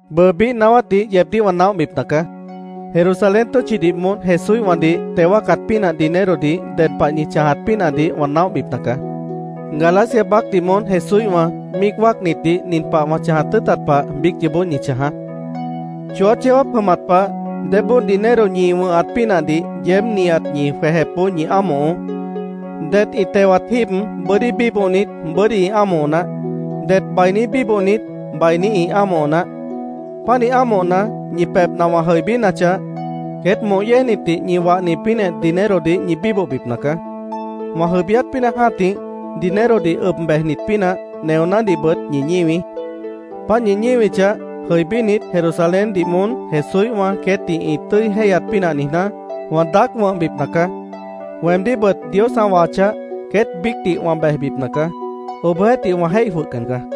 Bʉʉ biíh naáwátdih yeebdíh wã naóhbipna caá. Jerusalén tʉ́tchidih moón Jesúíhwãdih teo wáacat pínah dinerodih ded pah ñi chãjat pínahdih wã naóhbipna caá. Galacia baácdih moón Jesúíhwã míic wáacnitdih nin pah wã chãjat tʉ́ʉtat pah biíc yoobó ñi chãjaá: Chooát yeó jáap jʉmat pah débóo dinero ñi wʉ̃hat pínahdih yeéb nihat ñi jwejepboó ñi ámohoó. Det ĩ tewat jíib bʉ́dí bíbohnit, bʉ́dí ĩ ámoho naáh. Det bainí bíbohnit, bainí ĩ ámoho naáh. Pánih ámohna, ñi pebhna wã jʉibínachah, queét moh yéejnitdih ñi wahni pínah dinerodih ñi bíbohbipna caá. Wã jʉibíát pínah jã́tih, dinerodih ʉb bejnit pínah neonádihbʉt ñi ñíwií. Páant ñi ñíwichah, jʉibínit, Jerusaléndih moón Jesúíhwã queétdih ĩ tʉ́i jéihyat pínah niijná, wã daác wʉ̃hbipna caá. Weemdíhbʉt Dios ã wahachah, queét biícdih wã bejbipna caá. Obohjeéhtih, wã jéih jwʉhcan caá.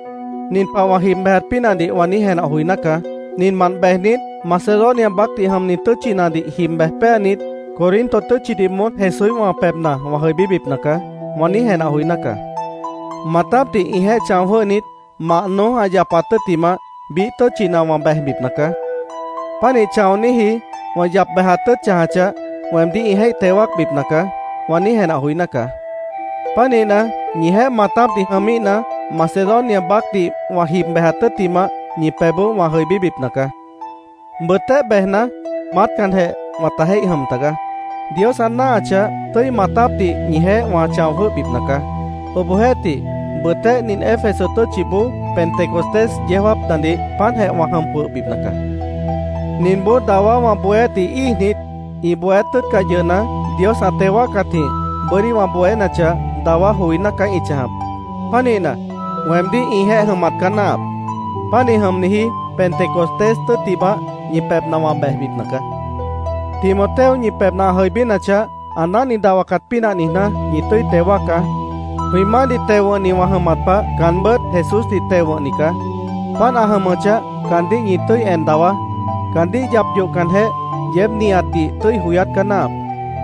Nin pah wã jib bejat pínahdih wã niíj jenah joiná caá: “Ninmant bejnit, Macedonia baácdih jʉmni tʉ́tchinadih jib bej péanit, Corinto tʉ́tchidih moón Jesúíhwã pebhna wã jʉibíbipna caá”, wã niíj jenah joiná caá. “Maatápdih ĩjeéh chão jwʉ́hnit, mah noój ã yapat tʉ́ttimah, biíh tʉ́tchina wã bejbipna caá. Pánih chãoníji wã yap bejat tʉ́ʉt chãjachah, weemdíh ĩ jéih teo wáacbipna caá”, wã niíj jenah joiná caá. Pánihna, ñijeéh maatápdih jʉmíhna, Macedonia baácdih wã jib bejat tʉ́ttimah ñi pebhboó wã jʉibíbipna caá. Bʉtéh bejna, maátcanjeh wãta jéih jʉm tagaá. Dios ã náahachah, tʉ́i maatápdih ñijeéh wã chão jwʉ́hbipna caá. Obohjeéhtih, bʉtéh nin Éfeso tʉ́tchiboó Pentecostés yeó jáapnadih páantjeh wã jʉm jwʉhbipna caá. Ninboó dawá wã bohéátdih íijnit, ĩ bohéát tʉ́ʉtcah yʉhna, Dios ã teo wáacatjĩh bʉ́dí wã bohénachah, dawá joiná caá ĩ chãjap. Pánihna, weemdíh ĩjeéh jʉmat caá náahap. Pánih jʉmniji Pentecostés tʉ́ttimah, ñi pebhna wã bejbipna caá. Timoteo ñi pebhna ã jʉibínachah, ã náhni dahwacat pínah niijná, ñi tʉ́i teo wáacá. Jwĩ Maáhdih teo wʉ̃hni wã jʉmat pah, caanbʉ́t Jesúsdih teo wʉ̃hni caá. Páant ã jʉmʉchah, caandíh ñi tʉ́i en dawaá. Caandíh yap yohcanjeh, yeéb nihatdih tʉ́i joyát caá náahap.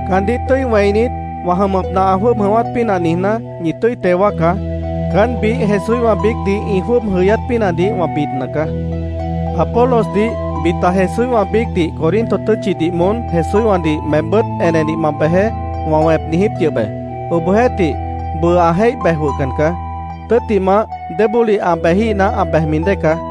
Caandíh tʉ́i wẽinit, wã jʉmʉpna ã jwʉ́ʉb jʉ̃ʉ́wát pínah niijná, ñi tʉ́i teo wáacá. Caán, biíh Jesúíhwã biícdih ĩ jwʉ́ʉb jʉyát pínahdih wã bidna caá. Apolosdih “Bita Jesúíhwã biícdih Corinto tʉ́tchidih moón Jesúíhwãdih meembʉ́t enedih ma bejeé”, wã wẽp niijíp yʉh be. Obohjeéhtih, bʉʉ ã jéih bej jwʉhcan caá. Tʉ́ttimah, débólih ã bejíhna, ã bejmi dée caá.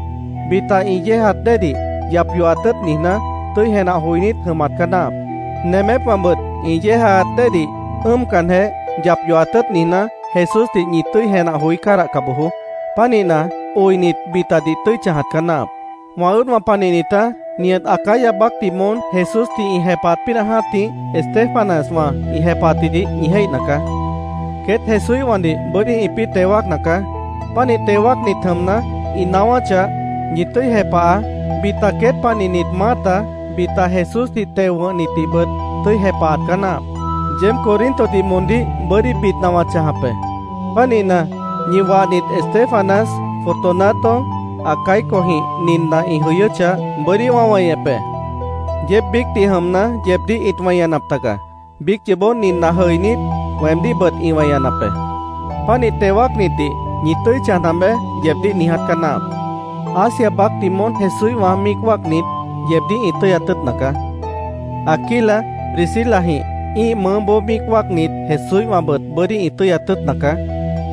Bita ĩ yéejaat déedih yap yohat tʉ́ʉt niijná, tʉ́i jenah joinít jʉmat caá náahap. Nemépwãbʉt ĩ yéejaat déedih ʉ́ʉmcanjeh, yap yohat tʉ́ʉt niijná, Jesúsdih ñi tʉ́i jenah joí cádahca bojoó. Pánihna, oinit, bitadih tʉ́i chãjat caá náahap. Wã ʉ́ʉdwã panihnitá, nihat Acaya baácdih moón Jesúsdih ĩ jepahat pínah jã́tih, Estéfanaswã ĩ jepahatjidih ñi jéihna caá. Queét Jesúíhwãdih bʉ́dí ĩpĩ́ teo wáacna caá. Pánih teo wáacnit jʉmna, ĩ naáwáchah, ñi tʉ́i jepahaá. Bita queét panihnit maáta, bita Jesúsdih teo wʉ̃hnitdihbʉt tʉ́i jepahat caá náahap. Yeéb Corintodih moondíh bʉ́dí bidna wã chãjap be. Pánihna, ñi wahnit Estéfanas, Fortunato, Acaicojĩh ninna ĩ jʉyʉ́chah, bʉ́dí wã weñep be. Yeéb biícdih jʉmna, yeebdíh ĩt weñanap tagaá. Biíc yoobó ninna jʉinít, weemdíhbʉt ĩ weñanap be. Pánih teo wáacnitdih “Ñi tʉ́i chãjap be”, yeebdíh niiját caá náahap. Asia baácdih moón Jesúíhwã míic wáacnit yeebdíh ĩ tʉ́yat tʉ́ʉtna caá. Aquila, Priscilajĩh ĩ́ih mʉʉ́boó míic wáacnit Jesúíhwãbʉt bʉ́dí ĩ tʉ́yat tʉ́ʉtna caá.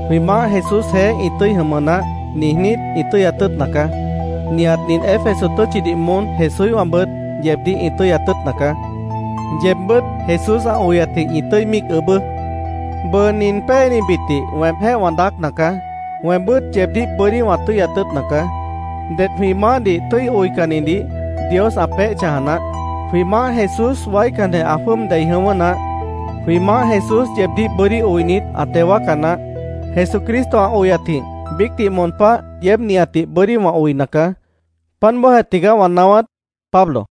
“Jwĩ Maáh Jesúsjeéh ĩ tʉ́i jʉmʉ naáh”, niijnít, ĩ tʉ́yat tʉ́ʉtna caá. Nihat nin Éfeso tʉ́tchidih moón Jesúíhwãbʉt yeebdíh ĩ tʉ́yat tʉ́ʉtna caá. Yeebbʉ́t Jesús ã oyatjĩh ñi tʉ́i míic ʉʉ́bʉ́. Bʉʉ nin péenibitdih weemjéh wã daácna caá. Weembʉ́t yeebdíh bʉ́dí wã tʉ́yat tʉ́ʉtna caá. Ded jwĩ Maáhdih tʉ́i oicannidih Dios ã peéh chãja naáh. Jwĩ Maáh Jesús waícanjeh ã jwʉ́ʉb dei jʉ̃ʉ́wʉ́ naáh. Jwĩ Maáh Jesús yeebdíh bʉ́dí oinit, ã teo wáaca naáh. Jesucristo ã oyatjĩh biícdih moon páh yeéb nihatdih bʉ́dí wã oina caá. Páant bóojeh tigaá wã naáwát. Pablo